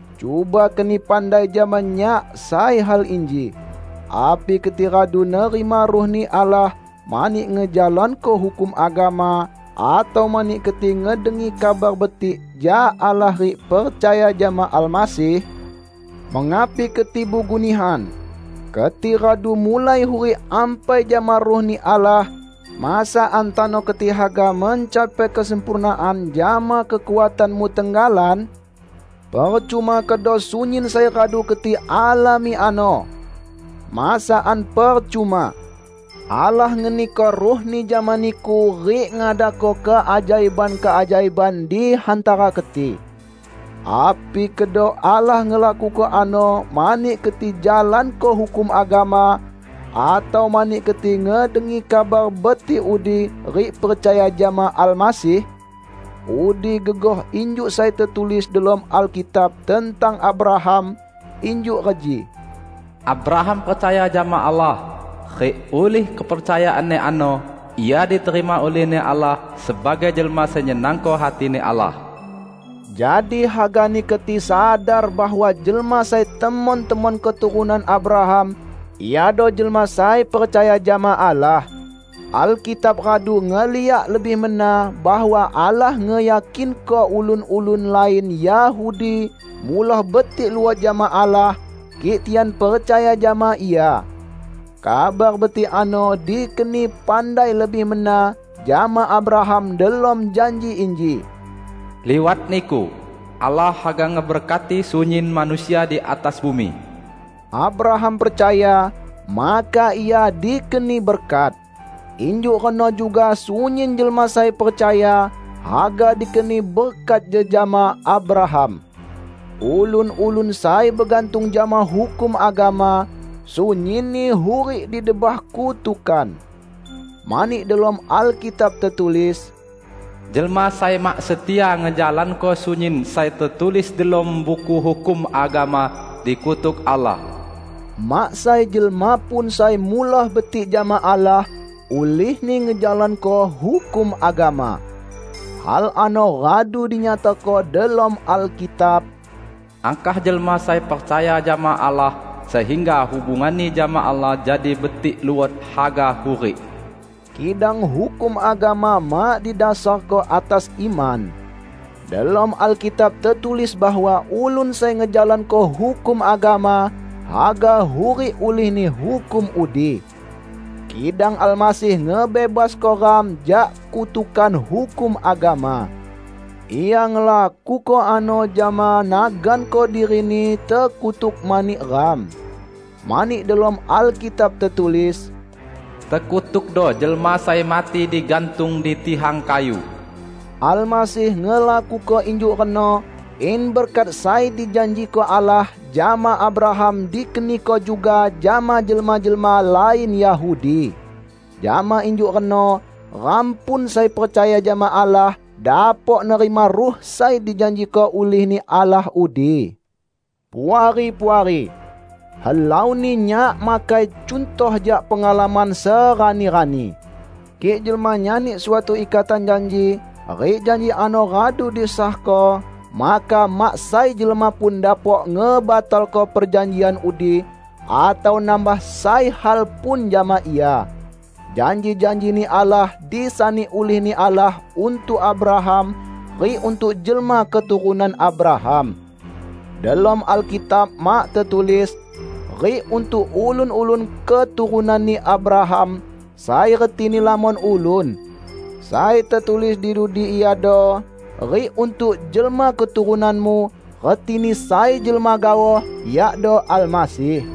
Cuba keni pandai jama nyak sai hal inji: Api keti radu nerima Ruh-Ni Allah mani ngejalanko hukum agama, atau mani keti ngedengi Kabar Betik jak Allah rik percaya jama Almasih? Mengapi keti bugu nihan! Keti radu mulai hurik ampai jama Ruh-Ni Allah, masakan tano keti haga mencapai kesempurnaan jama kekuatanmu tenggalan? Percuma kedo sunyin sai radu keti alami ano! Masakan percuma! Allah ngeniko Ruh-Ni jama niku rik ngadako keajaiban-keajaiban di hantara keti. Api kedo Allah ngelakuko ano mani keti jalanko hukum agama atau mani keti ngedengi Kabar Betik udi rik percaya jama Almasih? Udi gegoh injuk sai tetulis delom Alkitab tentang Abraham -- injuk reji, "Abraham percaya jama Allah, rik ulih kepercayaanni ano ia diterima ulih-Ni Allah sebagai jelma sai nyenangko hati-Ni Allah." Jadi hagani keti sadar bahwa jelma sai temon-temon keturunan Abraham iado jelma sai percaya jama Allah. Alkitab radu ngeliak lebih mena bahwa Allah ngeyakinko ulun-ulun lain Yahudi muloh betik luot jama Allah, kik tian percaya jama Ia. Kabar Betik ano dikeni pandai lebih mena jama Abraham delom janji inji, "Liwat niku, Allah haga ngeberkati sunyin manusia di atas bumi." Abraham percaya, maka ia dikeni berkat. Injuk reno juga sunyin jelma sai percaya, haga dikeni berkat jejama Abraham. Ulun-ulun sai begantung jama hukum agama, sunyinni hurik di debah kutukan. Mani delom Alkitab tetulis, "Jelma sai mak setia ngejalanko sunyin sai tetulis delom Buku Hukum Agama, dikutuk Allah!" Mak sai jelma pun sai muloh betik jama Allah ulihni ngejalanko hukum agama. Hal ano radu dinyatako delom Alkitab, "Angkah jelma sai percaya jama Allah sehingga hubunganni jama Allah jadi betik luot, haga hurik!" Kidang hukum agama mak didasarko atas iman. Delom Alkitab tetulis bahwa ulun sai ngejalanko hukum agama, haga hurik ulihni hukum udi. Kidang Almasih ngebebasko ram jak kutukan hukum agama. Ia ngelakuko ano jama naganko diri-Ni tekutuk mani ram. Mani delom Alkitab tetulis, "Tekutukdo jelma sai mati digantung di tihang kayu." Almasih ngelakuko injuk reno in berkat sai dijanjiko Allah jama Abraham dikeniko juga jama jelma-jelma lain Yahudi. Jama injuk reno ram pun sai percaya jama Allah, dapok nerima Ruh sai dijanjiko ulih-Ni Allah udi. Puari-puari! Helauni nyak makai cuntoh jak pengalaman serani-rani. Kik jelma nyani suatu ikatan janji rik janji ano radu disahko, maka mak sai jelma pun dapok ngebatalko perjanjian udi, atau nambah sai hal pun jama ia. Janji-janji-Ni Allah disani ulih-Ni Allah untuk Abraham rik untuk jelma keturunan Abraham. Delom Alkitab mak tetulis, "rik untuk ulun-ulun keturunanni Abraham", sai retini lamon ulun. Sai tetulis di dudi iado, "rik untuk jelma keturunanmu," retini sai jelma gaoh, yakdo Almasih.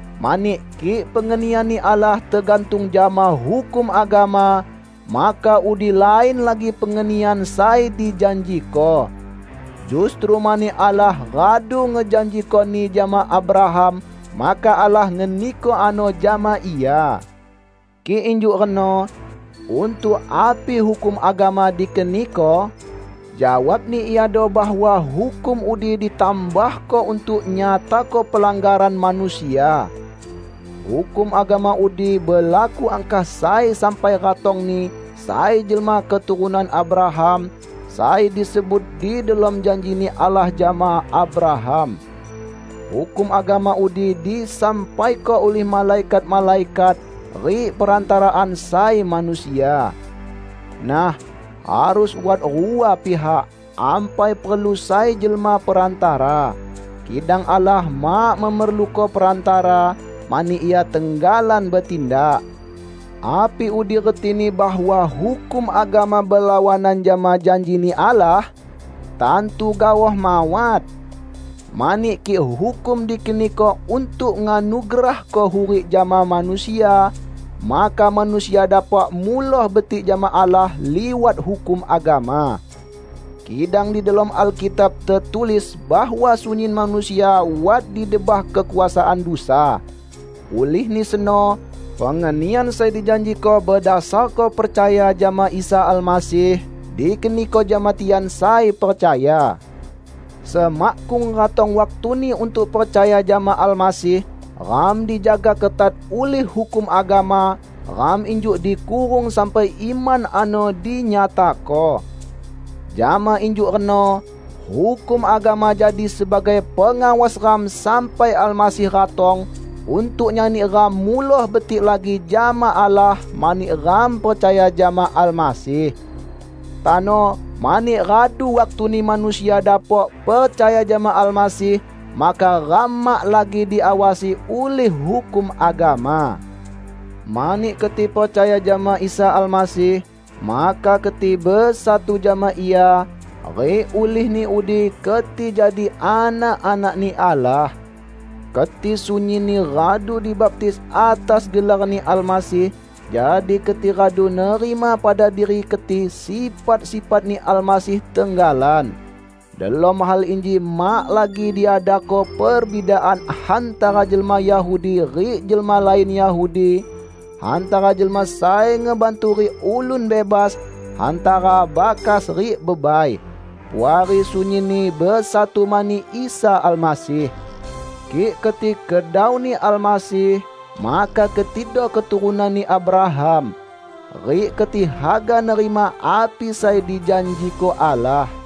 Mani kik pengenian-Ni Allah tegantung jama hukum agama, maka udi lain lagi pengenian sai dijanjiko. Justru mani Allah radu ngejanjikoni jama Abraham, maka Allah ngeniko ano jama ia. Kik injuk reno, untuk api hukum agama dikeniko? Jawabni iado bahwa hukum udi ditambahko untuk nyatako pelanggaran manusia. Hukum agama udi belaku angkah sai sampai ratongni sai jelma keturunan Abraham, sai disebut di delom janji-Ni Allah jama Abraham. Hukum agama udi disampaiko ulih malaikat-malaikat rik perantaraan sai manusia. Nah, harus wat rua pihak, ampai perlu sai jelma perantara. Kidang Allah mak memerluko perantara, mani Ia tenggalan betindak. Api udi retini bahwa hukum agama belawanan jama janji-Ni Allah? Tantu gaoh mawat! Mani kik hukum dikeniko untuk nganugerahko hurik jama manusia, maka manusia dapok muloh betik jama Allah liwat hukum agama. Kidang di delom Alkitab tetulis bahwa sunyin manusia wat di debah kekuasaan dusa. Ulihni seno, pengenian sai dijanjiko bedasarko percaya jama Isa Almasih dikeniko jama tian sai percaya. Semakkung ratong waktuni untuk percaya jama Almasih, ram dijaga ketat ulih hukum agama; ram injuk dikurung sampai iman ano dinyatako. Jama injuk reno, hukum agama jadi sebagai pengawas ram sampai Almasih ratong untuk nyani ram muloh betik lagi jama Allah mani ram percaya jama Almasih. Tano, mani radu waktuni manusia dapok percaya jama Almasih, maka ram mak lagi diawasi ulih hukum agama. Mani keti percaya jama Isa Almasih, maka keti besatu jama Ia; rik ulihni udi keti jadi anak-anak-Ni Allah. Keti sunyinni radu dibaptis atas gelar-Ni Almasih, jadi keti radu nerima pada diri keti sifat-sifat-Ni Almasih tenggalan. Delom hal inji mak lagi diadako perbidaan hantara jelma Yahudi rik jelma lain Yahudi, hantara jelma sai ngebantu rik ulun bebas, hantara bakas rik bebai. Puari sunyinni besatu mani Isa Almasih. Kik keti kedau-Ni Almasih, maka ketido keturunanni Abraham. Rik keti haga nerima api sai dijanjiko Allah.